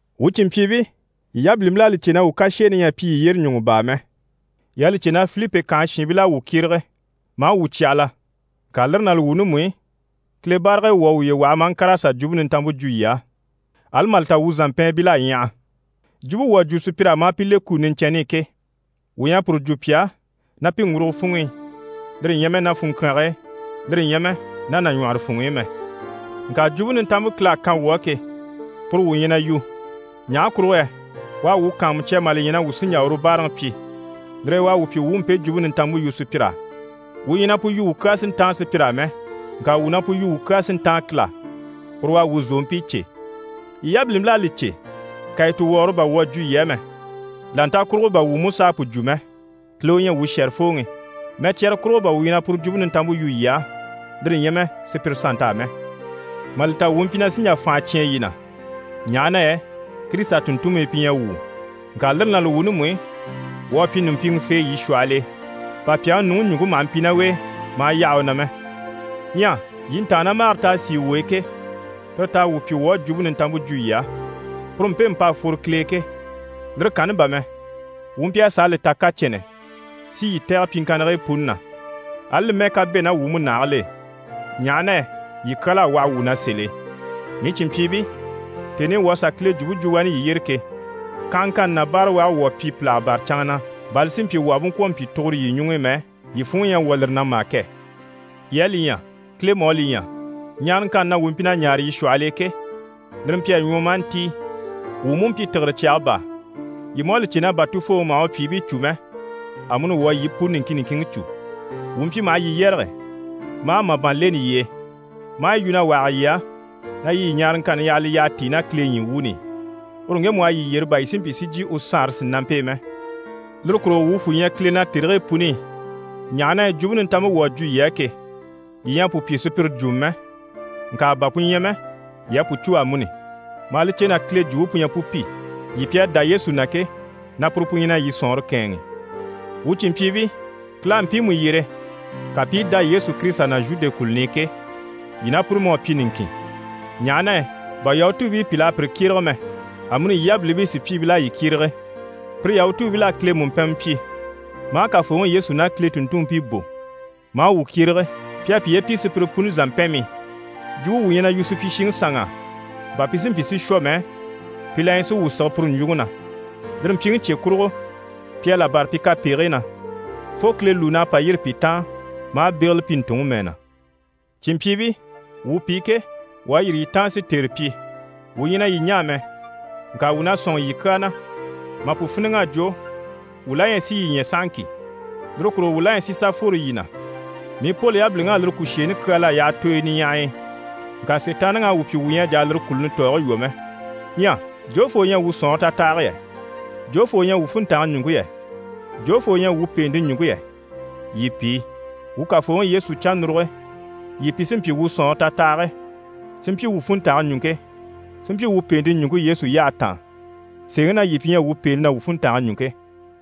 Wuu cìnmpyiibii, yii yabilimpil'à li cè na wuu kasheeni ɲyɛ a pyi yii yyére ɲùŋɔ baa mɛ. Yii à li cè na Filipi kànhe shiinbil'à wuu kyérege, maa wuu cyahala, ŋka lire ná li wuuni mú i, Kile barag'e, wuu à wuye waha maa ŋkàr'a sà Jwumpe Nintanmpe jwo yii á, ali mà li ta wuu zàmpɛɛnbil'à ɲyaha. Jwumpe wuu à jwo sùpyir'á maa pi le kuni niɲcɛnni i ke, wuu ɲyɛ a puru jwo pi á ná pi ŋgurugo funŋ'i, lire ɲyɛ mɛ ná funŋkyaange e, lire ɲyɛ mɛ ná nàɲwɔhɔrɔ funŋ'i mɛ. Ŋka Jwumpe Nintanmpe Kile à kan wuu á ke, puru wuu ɲyɛ na yu. Ɲaha kurugo yɛ u à wuu kàanmucya mà li ɲya na wuu sí n‑jà uru báaraŋi pyi, lire e u à wuu pyi wuu u mpe Jwumpe Nintanmpe yu sùpyir'á. Wuu ɲyɛ na pu yu wuu kyaa si ntáan sùpyir'á mɛ, ŋka wuu na pu yu wuu kyaa si ntáan Kile á. Uru u à wuu zòompii cè. Yii yabilimpil'à li cè kàyituwɔgɔrɔ bà wuu à jwo yii á mɛ, là nta kurugo bà wuu mú s'à pu jwo mɛ. Kile u ɲyɛ wuu shɛ̀rɛfooŋi. Mɛcyara kurugo bà wuu ɲyɛ na puru Jwumpe Nintanmpe yu yii á, lire ɲyɛ mɛ sùpyire sannt'á mɛ. Mà li ta wuu mpyi na sí n‑jà fànha cyán yii na, ɲaha na yɛ Kirisita tùnntunmii pi ɲyɛ wuu. Ŋka lire ná li wuuni mú i, wuu à pyi ɲùmpiŋɛfee yii shwɔhɔl'e, bà pyàŋi nuŋi ɲùŋke maha mpi ná u e, maa yaha u na mɛ. Ɲyɛ yii ntàannamagare t'à sìi wuu e ke, tire t'à wuu pyi wuu à Jwumpe Nintanmpe jwo yii á, puru mpemu p'à fworo Kile e ke. Lire kanni bà mɛ, wuu mpyi a sàa li ta kacɛnnɛ si yii tɛ̀gɛ pyiŋkannigii puni na, ali li mɛ́ɛ ká bɛ̂ ná wuu múnahigil'e, ɲaha na yɛ yii kyal'à waha wuu na sèl'e. Mii cìnmpyiibii, tèni i wuu à sà Kile jwumpe jwo wani yii yyére ke, kanhaŋkanni ná báarawage wuu à pyi pìlaga bâra canŋa na, bà li si mpyi wuu àha bú ŋkwɔ̀ mpyi tuguro yii ɲuŋ'i mɛ, yii funŋɔ ɲyɛ a wwɔ̀ lire na mà kɛ! Yii à li ɲya, Kile mú à li ɲya, ɲaaraŋkanni na wuu mpyi na ɲaare yii shwɔhɔl'e ke, lire mpyi a ɲwɔ maa ntíi, wuu mú mpyi tìgire cyaga baa. Yii mú à li cè na bà tufooŋi maha u pyìibii cû mɛ, amuni wuu à yii puni niŋkin niŋkinŋi cû. Wuu mpyi maha yii yɛrɛge maa màban leni yii e, maa yi yu na wahage yii á, na yii yii ɲaaraŋkanni yaha li yyaha tíi ná Kile ɲyii wuuni i, uru ŋgemu u à yii yyere, bà yii si mpyi si jyè u Saanre sìnampe e mɛ. Lire kurugo wuu fwù ɲyɛ Kile na tèrigii puni i, ɲaha na yɛ Jwumpe Nintanmpe wuu à jwo yii á ke, yii ɲyɛ a pu pyi sùpyire jwumɔ mɛ. Ŋka bà pu ɲyɛ mɛ, yii à pu cû amuni, maa li cè na Kile jwumpe pu ɲyɛ pu pi, yii pi à dá Yesu na ke, na puru pu ɲyɛ na yii sɔ̀nŋɔre kɛ̂ɛnŋi. Wuu cìnmpyiibii, Kile à mpiimu yyere ka pi i dá Yesu Kirisita na Zhude kùluni i ke, yii ná pire mú à pyi niŋkin, ɲaha na yɛ bà Yahutuubii pìl'à pire kyérege mɛ, amuni yii yabilimpii sùpyiibil'à yii kyérege. Pire Yahutuubil'à Kile mùmpɛnmɛ pyi maa Kafooŋi Yesu ná Kile tùnntunmpii bò, maa wuu kyérege. Pi à piye pyi sùpyire puni zàmpɛnmii. Jwumpe wuu ɲyɛ na yu supyishiŋi sanŋ'á, bà pi si mpyi si shwɔ mɛ, pi la ɲyɛ si wuu sige puru ɲjwuŋi na. Lire mpyiŋi cye kurugo, pi à là bâra pi kapegigii na, fo Kile lùun'à pa yîri pi taan maa bégele pi ntùnŋi mɛɛ na. Cìnmpyiibii, wuu pi ke, wuu à yîri yii taan si tère pyi, wuu ɲyɛ na yii ɲaa mɛ. Ŋka wuu na sɔ̂nŋi yii kyaa na. Mà pu fíniŋ'a jwo, wuu la ɲyɛ si yii ɲya sahaŋki. Lire kurugo wuu la ɲyɛ si sà fworo yii na. Mii Poli yabiliŋ'á lire kùsheeni kyal'à yaha tooyo niɲyahay'e, ŋka Sitaanniŋi à wuu pyi wuu ɲyɛ a jà a lire kùluni tɔɔge lwɔ́ mɛ. Ɲyɛ jofoo u ɲyɛ wuu sɔ̀nŋɔre tatahage yɛ? Jofoo u ɲyɛ wuu funntange ɲùŋke yɛ? Jofoo u ɲyɛ wuu pèente ɲùŋke yɛ? Yii pi. Wuu Kafooŋi Yesu cannuruge, yii pi sí n‑pyi wuu sɔ̀nŋɔre tatahage, si mpyi wuu funntange ɲùŋke, si mpyi wuu pèente ɲùŋke Yesu yyahe taan. Sèeŋi na, yii pi ɲyɛ wuu pèente ná wuu funntange ɲùŋke.